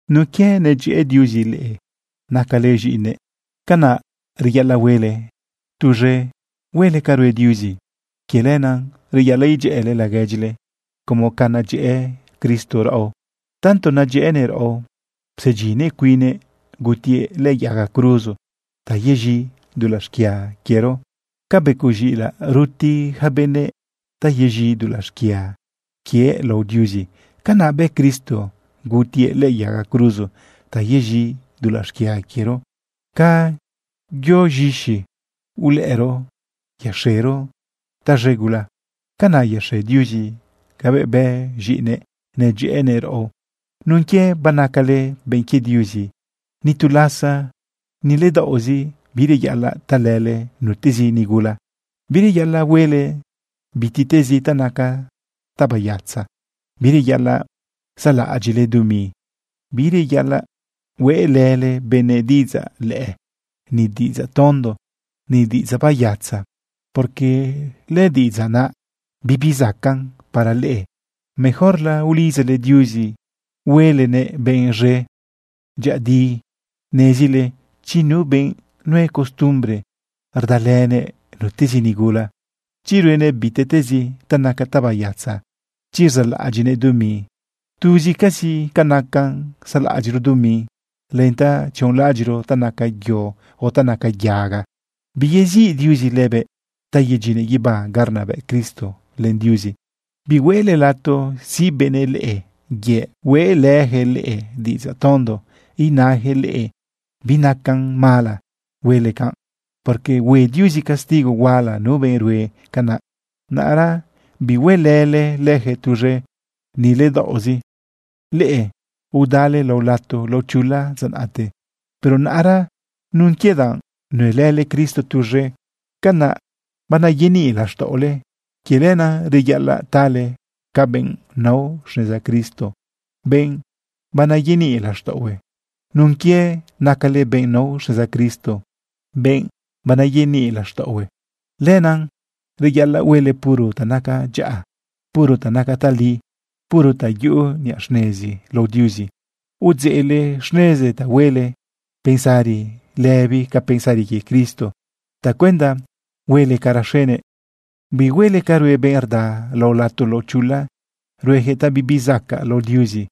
Nun quie nedyëꞌë Diuzi leꞌe nacale z̃iꞌinëꞌ, canaꞌ reyaꞌalaꞌ huele tuz̃e huele ca rue Diuzi. Quie lenaꞌ reyaꞌalaꞌ edyëꞌële laguedyile como ca nedyëꞌë Cristo raꞌo. Tanto nedyëꞌënëꞌ raꞌo psedyinnëꞌ cuinnëꞌ gutiëꞌ lëꞌë yaga cruzo ta yez̃i dulaꞌ xquia quiero. Ca becoꞌ z̃iꞌilaꞌ ruti ja benëꞌ ta yez̃i dulaꞌ xquia quie lao Diuzi, canaꞌ bë Cristo gutiëꞌ lëꞌë yaga cruzo, ta yez̃i dulaꞌ xquia quiero. Ca yo z̃ixi ulëꞌëro yaxero taz̃e gula, canaꞌ yaxe Diuzi cabëꞌ bë z̃iꞌinëꞌ nedyëꞌënëꞌ raꞌo. Nun quie banacale benꞌ quie Diuzi, ni tu lasa, ni ledaoꞌzi, bireyaꞌalaꞌ talële nutezi nigula, bireyaꞌalaꞌ huele bitiꞌtezi ta naca tabayatza, bireyaꞌalaꞌ saꞌlaꞌadyiꞌle dumi. Bireyaꞌalaꞌ hueꞌlële benëꞌ diꞌidzaꞌ lëꞌë, ni diꞌidzaꞌ tonto, ni diꞌidzaꞌ bayatza, porque lëdiꞌidzaꞌ naꞌ, bibi zacaꞌn para leꞌe. Mejorla ulidzale Diuzi huelenëꞌ benꞌ z̃e. Dyëꞌëdi nezile chi nu benꞌ nue costumbre rdalënëꞌ nutezi nigula, chi ruenëꞌ bitiꞌtezi ta naca tabayatza, chi rzaꞌlaꞌadyiꞌnëꞌ dumi, (tuzcazi nacan saꞌlaꞌadyiꞌro dumi, len ta tzionlaꞌadyiꞌro ta naca yo o ta naca yaga), biyeziꞌ Diuzi lëbëꞌ ta yedyinnëꞌ guibá ga rnabëꞌ Cristo len Diuzi. Bihueꞌle lato siꞌ benëꞌ leꞌe yëꞌ hueꞌlëyaquëꞌ leꞌe diꞌidzaꞌ tondo inayaquëꞌ leꞌe binacan mala huele canꞌ, porque hue Diuzi castigo huala nu benꞌ rue canaꞌ. Naꞌra bihuelële leyaquëꞌ tuz̃e, ni ledaoꞌzi. Leꞌe udale lao lato lao chula dza naꞌte. Pero naꞌra nun quie danꞌ nuelële Cristo tuz̃e, canaꞌ banayeniꞌ laxtaꞌole. Quie lenaꞌ reyaꞌalaꞌ tale ca benꞌ nao xneza Cristo, benꞌ banayeniꞌ laxtaꞌohue. Nun quie nacale benꞌ nao xneza Cristo, benꞌ banayeniꞌ laxtaꞌohue, lenaꞌ reyaꞌalaꞌ huele puro ta naca dyaꞌa, puro ta naca tali, puro ta yuꞌu niꞌa xnezi lao Diuzi. Udzeꞌle xneze ta huele pensari lëbi ca pensari quie Cristo tacuenda huele ca raxenëꞌ. Bihuele ca rue benꞌ rda lao lato lao chula. Ruejëꞌ ta bibizacaꞌ lao Diuzi.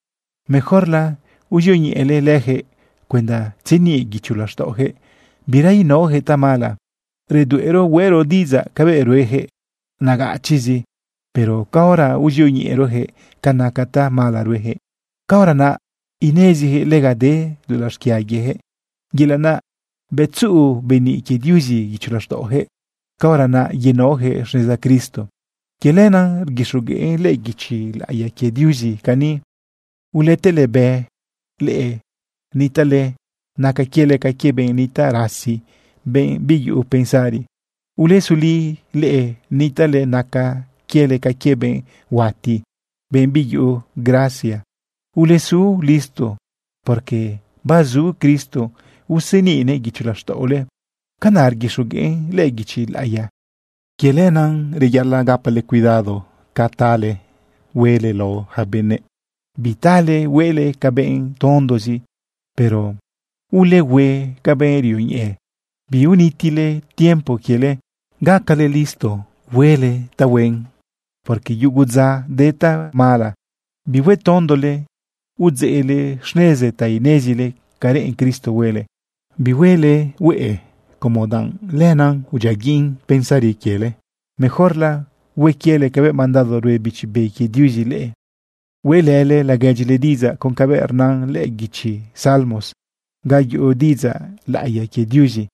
Mejorla uzioñeꞌele leyaquëꞌ cuenda tzeniꞌ guicho laxtaꞌoyaquëꞌ bira inaoyaquëꞌ tamala. Redueꞌro huero diꞌidzaꞌ cabëꞌ ruejëꞌ nagachizi. Pero caora uzioñeꞌerojëꞌ ca naca tamala ruejëꞌ, caora naꞌ inezijëꞌ lega de dulaꞌ xquia quiejëꞌ, yelaꞌ naꞌ bëꞌ tzuꞌu beniꞌ quie Diuzi guicho laxtaꞌojëꞌ, caora naꞌ yenaojëꞌ xneza Cristo. Quie lenaꞌ rguixogueꞌn lëꞌë guichi laꞌiya quie Diuzi cani: Uletëlebë leꞌe nitaꞌle naca quiele ca quie benꞌ nitaꞌ rasi, benꞌ biyuꞌu pensari. Ulesuli leꞌe nitaꞌle naca quiele ca quie benꞌ huati, benꞌ biyuꞌu gracia. Ulesu listo, porque bazu Cristo useniꞌnëꞌ guicho laxtaꞌole. Canaꞌ rguixogueꞌn lëꞌë guichi laꞌiya. Quie lenaꞌ reyaꞌalaꞌ gapale cuidado ca tale huele lao yaca benëꞌ. Bitale huele ca benꞌ tondozi, pero ulehue ca benꞌ rioñeꞌe. Biunitile tiempo quiele. Gacale listo huele tahuen, porque yugu dza de tamala. Bihuetondole. Udzeꞌle xneze ta inezile ca reꞌen Cristo huele. Bihuele hueꞌe como danꞌ lenaꞌ udyiaguiꞌn pensari quiele. Mejorla hue quiele cabëꞌ mandado rue Bichi Be quie Diuzi leꞌe. Hueꞌlële laguedyile diꞌidzaꞌ con cabëꞌ rnan lëꞌë guichi Salmos ga yuꞌu diꞌidzaꞌ laꞌiya quie Diuzi.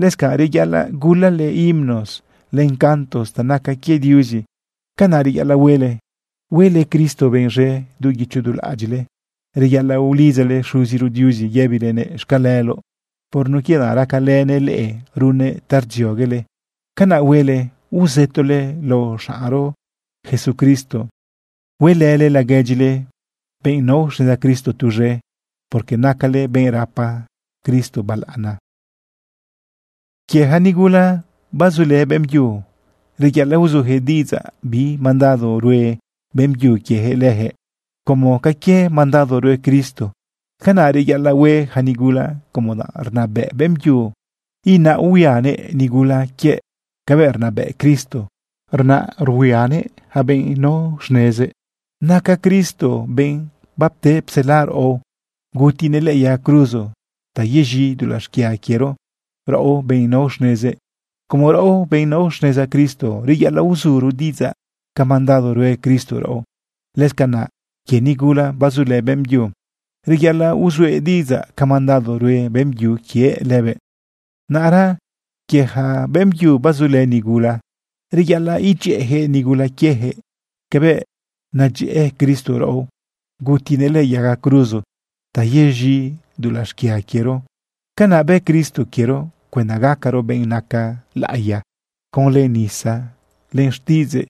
Lëscanꞌ reyaꞌalaꞌ gulale himnos len cantos ta naca quie Diuzi. Canaꞌ reyaꞌalaꞌ huele, huele Cristo benꞌ z̃e du guicho du laꞌadyiꞌle. Reyaꞌalaꞌ ulidzale Xuziro Diuzi yëbilenëꞌ xcaleloꞌ por nun quie danꞌ racalënëꞌ leꞌe runnëꞌ ta rdzioguele. Canaꞌ huele uzëtole lao xaꞌnro Jesucristo. Huelële laguedyile benꞌ nao xneza Cristo tuz̃e, porque nacale benꞌ rapa Cristo balaꞌana. Quie ja nigula bazulë beꞌmbyu, reyaꞌalaꞌ uzujëꞌ diꞌidzaꞌ bi mandado rue beꞌmbyu quiejëꞌ lëjëꞌ como ca quie mandado rue Cristo. Canaꞌ reyaꞌalaꞌ hue yaca nigula como danꞌ rnabëꞌ beꞌmbyu inaꞌ uhuianëꞌ nigula quiëꞌ cabëꞌ rnabëꞌ Cristo inaꞌ uhuianëꞌ yaca benꞌ nao xnezëꞌ. Naca Cristo benꞌ bapte psela raꞌo, gutinëꞌ lëꞌë yaga cruzo ta yez̃i dulaꞌ xquia quiero raꞌo, benꞌ nao xnezëꞌ. Como raꞌo, benꞌ nao xneza Cristo, reyaꞌalaꞌ uzuro diꞌidzaꞌ ca mandado rue Cristo raꞌo, lëscanaꞌ quie nigula bazulë beꞌmbyu, reyaꞌalaꞌ uzuëꞌ diꞌidzaꞌ ca mandado rue beꞌmbyu quiëꞌ lëbëꞌ. Naꞌra quie ja beꞌmbyu bazulë nigula, reyaꞌalaꞌ edyëꞌëjëꞌ nigula quiejëꞌ cabëꞌ nedyëꞌë Cristo raꞌo, gutinëꞌ lëꞌë yaga cruzo ta yez̃i dulaꞌ xquia quiero. Canaꞌ bë Cristo quiero cuenda gacaro benꞌ naca laꞌiya. Conlë nisa len xtiꞌidzëꞌ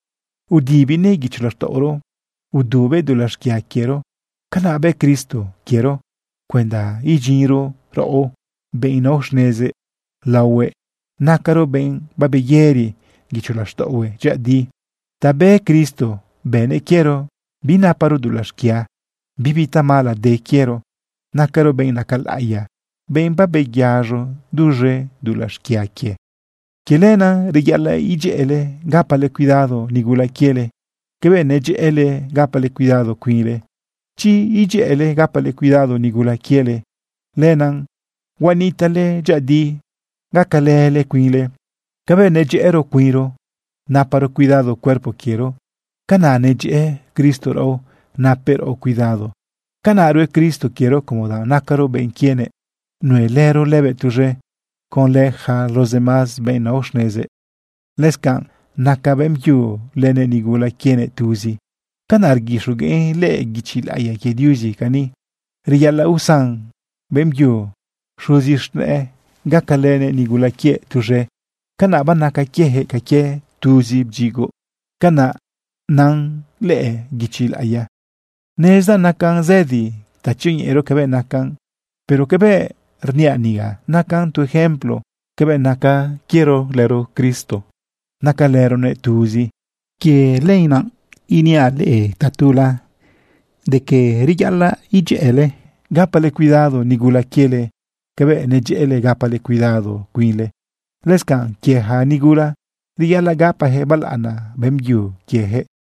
udibinëꞌ guicho laxtaꞌoro, udubëꞌ dulaꞌ xquia quiero. Canaꞌ bë Cristo quiero cuenda idyinro raꞌo, benꞌ nao xnezëꞌ, laohuëꞌ nacaro benꞌ babeyëri guicho laxtaꞌohue dyëꞌëdi. Ta bë Cristo bënëꞌ quiero binaparo dulaꞌ xquia, bibi tamala de quiero, nacaro benꞌ naca laꞌiya, benꞌ babeyaz̃o duz̃e dulaꞌ xquia quie. Quie lenaꞌ reyaꞌalaꞌ edyëꞌële gapale cuidado nigula quiele cabëꞌ nedyëꞌële gapale cuidado cuinle. Chi edyëꞌële gapale cuidado nigula quiele, lenaꞌ huanitaꞌle dyëꞌëdi, gacalële cuinle. Cabëꞌ nedyëꞌëro cuinro naparo cuidado cuerpo quiero, canaꞌ nedyëꞌë Cristo raꞌo napëꞌ raꞌo cuidado. Canaꞌ rue Cristo quiero como danꞌ nacaro benꞌ quienëꞌ, nuelëro lëbëꞌ tuz̃e conlë yaca los demás benꞌ nao xnezëꞌ. Lëscanꞌ naca beꞌmbyu lënëꞌ nigula quienëꞌ tuzi. Canaꞌ rguixogueꞌn lëꞌë guichi laꞌiya quie Diuzi cani: “Reyaꞌalaꞌ usan beꞌmbyu xuzi z̃nëꞌë gacalënëꞌ nigula quiëꞌ tuz̃e. Canaꞌ banaca quiejëꞌ ca quie tuzi bdyigoꞌ.” Canaꞌ nan lëꞌë guichi laꞌiya. Nezdaꞌ nacan zëdi ta tzioñeꞌero cabëꞌ nacan, pero cabëꞌ rniaꞌ niga, nacan tu ejemplo cabëꞌ naca quiero lëro Cristo. Nacalëronëꞌ tuzi. Quie lenaꞌ iniaꞌ leꞌe tatula de quie reyaꞌalaꞌ edyëꞌële gapale cuidado nigula quiele cabëꞌ nedyëꞌële gapale cuidado cuinle. Lëscanꞌ quie yaca nigula, reyaꞌalaꞌ gapajëꞌ balaꞌana beꞌmbyu quieyaquëꞌ.